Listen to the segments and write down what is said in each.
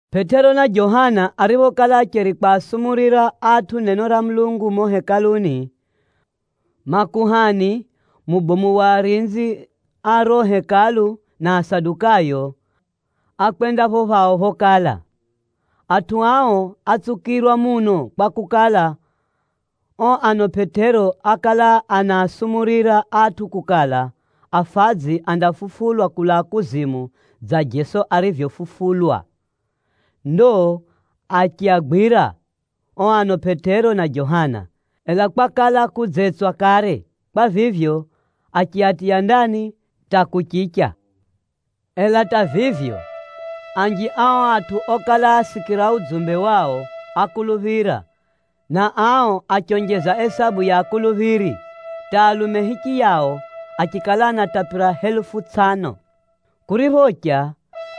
Pʼetero na Johana ariphokala acheri kwasumurira atʼu neno ra Mulungu mumo Hekaluni, makuhani, mubomu wa arinzi a riro Hekalu na Asadukayo, ákwenda pho phao phokala. Atʼu ao átsukirwa muno kwakukala, o ano Pʼetero ákala anaasumurira atʼu kukala, afadzi andafufulwa kulaa kuzimu dza Jeso arivyofufulwa. Ndo achiagwira o ano Pʼetero na Johana, ela kwakala kudzetswa kare. Kwa vivyo, achiatiya ndani hata kuchicha. Ela hata vivyo, anji a o atʼu okala asikira udzumbe wao, ákuluphira, na ao achionjeza isabu ya akuluphiri, hata alume hichiyao achikala anatapira helufu tsʼano. Kuriphocha,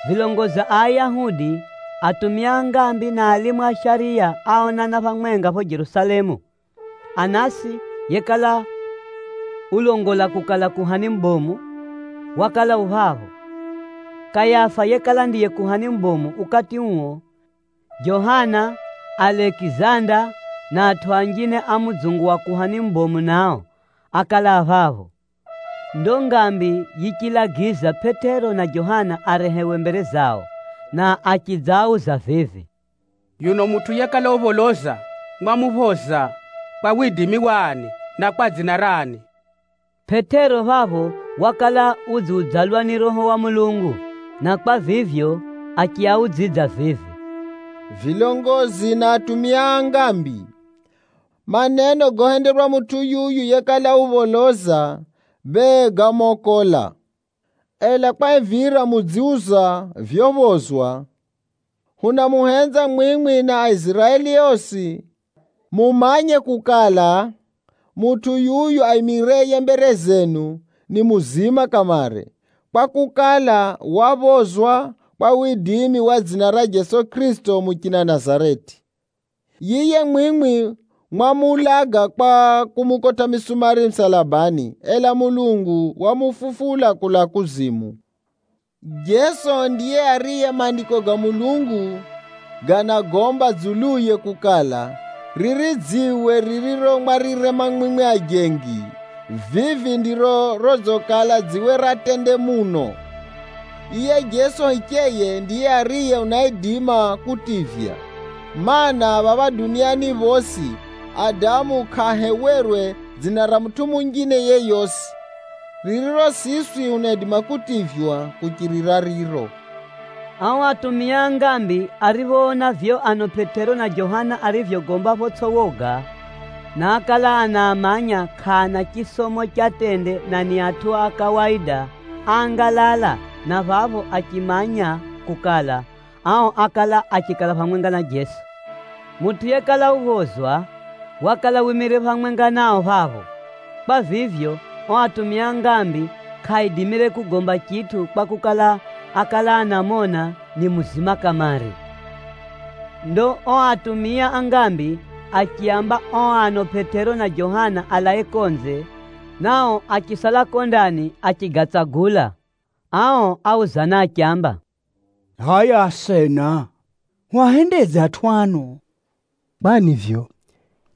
vilongozi a Ayahudi, atumia a ngambi na alimu a shariya áonana phamwenga pho Jerusalemu. Anasi yekala ulongola kukala kuhani mubomu, wakala u phapho. Kayafa yekala ndiye kuhani mubomu ukati uo, Johana, Alekizanda na atʼu anjine a mudzungu wa kuhani mubomu nao, ákala a phapho. Ndo ngambi yichilagiza Pʼetero na Johana arehewe mbere zao, na achidzaauza vivi, “Yuno mutʼu yekala upholoza mwamuphoza kwa widimi wa ani, na kwa dzina rani?” Pʼetero phapho wakala udziudzalwa ni Roho wa Mulungu, na kwa vivyo achiaudzidza vivi, “Vilongozi na atumia a ngambi! Maneno gohenderwa mutʼu yuyu yekala upholoza, bee gámokola. Ela kwahivira mudziuza vyophozwa, hunamuhenza mwimwi na Aiziraeli osi mumanye kukala, mutʼu yuyu aimireye mbere zenu, ni muzima kamare, kwakukala, waphozwa kwa widimi wa dzina ra Jeso Kʼirisito muchina Nazareti. Yiye mwimwi mwamuulaga kwa kumukotʼa misumari musalabani, ela Mulungu wamufufula kulaa kuzimu. Jeso ndiye ariye Maandiko ga Mulungu ganagomba dzuluye kukala, ‘Riri dziwe ririro mwarirema mwimwi ajengi, vivi ndiro rodzikala dziwe ra tende muno!’ “Yiye Jeso hicheye, ndiye ariye unaidima kutivya. Maana, phapha duniani phosi, adamu kʼaahewerwe dzina ra mutʼu munjine yeyosi, ririro siswi hunaidima kutivywa kuchirira riro.” Ao atumia a ngambi ariphoona vivyo ano Pʼetero na Johana arivyogomba photsʼi woga, na ákala anaamanya kʼaana chisomo cha tende na ni atʼu a kawaida, áangalala na phapho achiamanya kukala, ao ákala achikala phamwenga na Jeso. Mutʼu yekala uphozwa, wakala wimire phamwenga nao phapho. Kwa vivyo, o atumia a ngambi kʼaaidimire kugomba chitʼu kwakukala, ákala anamona ni muzima kamare. Ndo o atumia a ngambi achiaamba o ano Pʼetero na Johana alae konze, na o achisala ko ndani achigatsagula. Ao áuzana achiamba, “Hʼaya asena, hwahendedze atʼu ano? Kwani vivyo,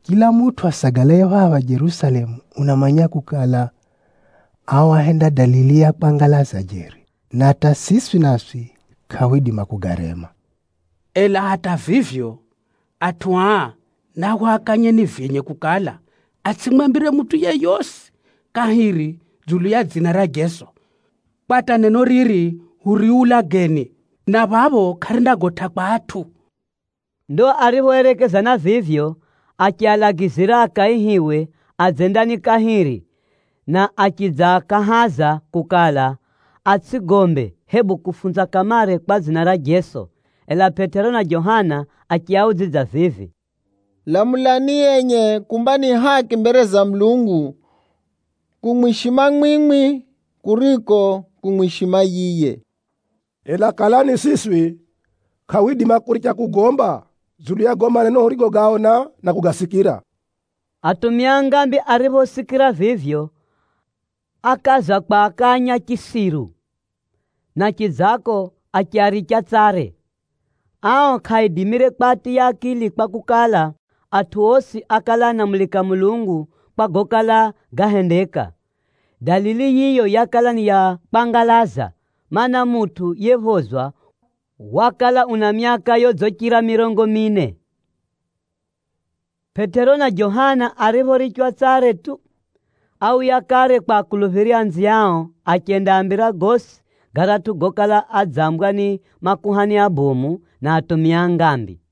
chila mutʼu asagalaye phapha Jerusalemu unamanya kukala, ao áhenda dalili ya kwangalaza jeri, na hata siswi naswi kʼahwidima kugarema. Ela hata vivyo, atʼu aa nahwakanyeni vyenye kukala, atsʼimwambire mutʼu yeyosi kahiri dzulu ya dzina ra Jeso, kwa hata neno riri huriulageni, na phapho kʼarindagotʼa kwa atʼu.” Ndo ariphoerekezana vivyo, achialagizira akaihiwe adze ndani kahiri, na achidzaakahaza kukala, atsʼigombe, hebu kufunza kamare kwa dzina ra Jeso. Ela Pʼetero na Johana achiaudzidza vivi, “Lamulani enye kumba ni haki mbere za Mulungu kumwishima mwimwi kuriko kumwishima yiye. Ela kala ni siswi, kʼahwidima kuricha kugomba dzulu ya gago maneno hurigogaona na kugasikira.” Atumia a ngambi ariphosikira vivyo, akaaza kwakanya chisiru, na chidzako achiaricha tsare. Ao kʼaaidimire kwatiya akili kwakukala, atʼu osi ákala anamulika Mulungu kwa gokala gahendeka. Dalili yiyo yakala ni ya kwangalaza, mana, mutʼu yephozwa wakala una myaka yodzichira mirongo mine. Pʼetero na Johana ariphorichwa tsare tu, áuya kare kwa akuluphiri anziao, achendaambira gosi garatʼu gokala adzambwa ni makuhani abomu, na atumia a ngambi.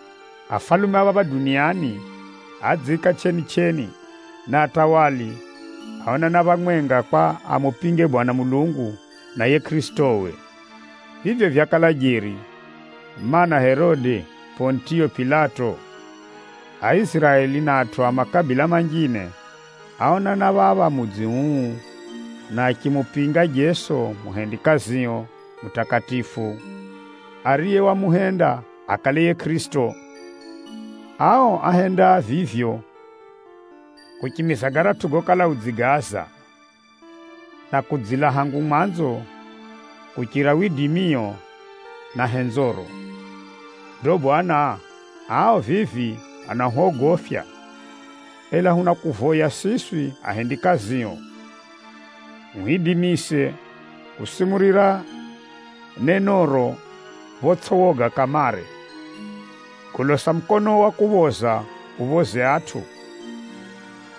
Afalume a duniani ádzidziika kwete, na atawala adzila ngewa phamwenga kwa amupinge Mwenyezi Mulungu na yiye Kʼirisitowe.’ “Vivyo vyakala jeri, mana, Herode, Pʼonitiyo Pilato, Aiziraeli na atʼu a makabila manjine áonana phapha mudzi uu, na achimupinga Jeso muhumikio mutakatifu, ariye wamuhenda akale yiye Kʼirisito. Ao áhenda vivyo kuchimiza garatʼu gokala udzigaaza, na kudzila hangu mwanzo kuchirira widimio na henzoro. Ndo Bwana, ao vivi anahwogofya, ela hunakuvoya siswi ahendikazio, uhwidimise kusumurira nenoro photsʼi woga kamare. Golosa mukonoo wa kuphoza uphoze atʼu,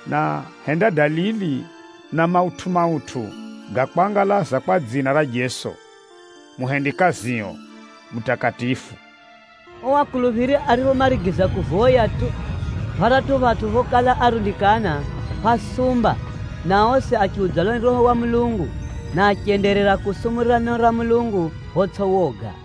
na henda dalili na mautʼu-mautʼu ga kwangalaza kwa dzina ra Jeso, muhumikio mutakatifu.” O akuluphiri ariphomarigiza kuvoya tu, pharatʼu phatʼu phokala arundikana, phásumba na osi achiudzalwa ni Roho wa Mulungu, na achenderera kusumurira neno ra Mulungu photsʼi woga.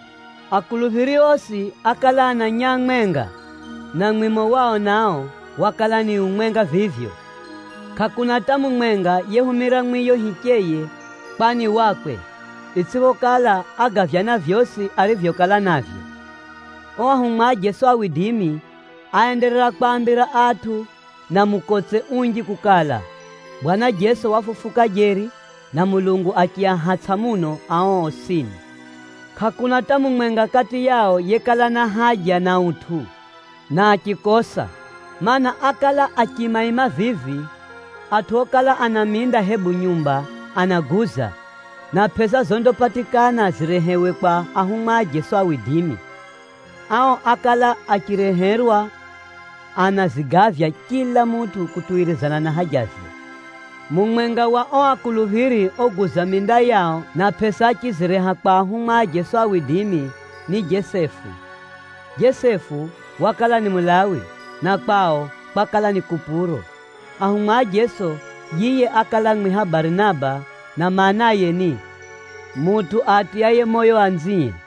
Akuluphiri osi ákala ana nyaa mwenga, na mwimo wao nao, wakala ni umwenga vivyo. Kʼakuna hata mumwenga yehumira mwiyo hicheye kwa ni wakwe, itsʼiphokala ágavyana vyosi arivyokala navyo. O ahumwa a Jeso áenderera kwaambira atʼu na mukotse unji kukala, Bwana Jeso wafufuka jeri, na Mulungu achiahatsʼa muno ao osini. Kʼakuna hata mumwenga kati yao yekala na haja na utʼu, na achikosa. Maana, ákala achiimaima vivi, atʼu okala ana minda hebu nyumba anaguza, na pʼesa zondapatikana zirehewe kwa ahumwa a Jeso. Ao ákala achireherwa anazigavya chila mutʼu kutuwirizana na hajaze. Mumwenga wa o akuluphiri oguza minda yao na pʼesa achizireha kwa ahumwa a Jeso, ni Jesefu. Jesefu wakala ni Mulawi, na kwao kwakala ni Kupuro. Ahumwa a Jeso, yiye ákala amwiha Barinaba na maanaye ni, “Mutʼu aatiyaye moyo anzie.”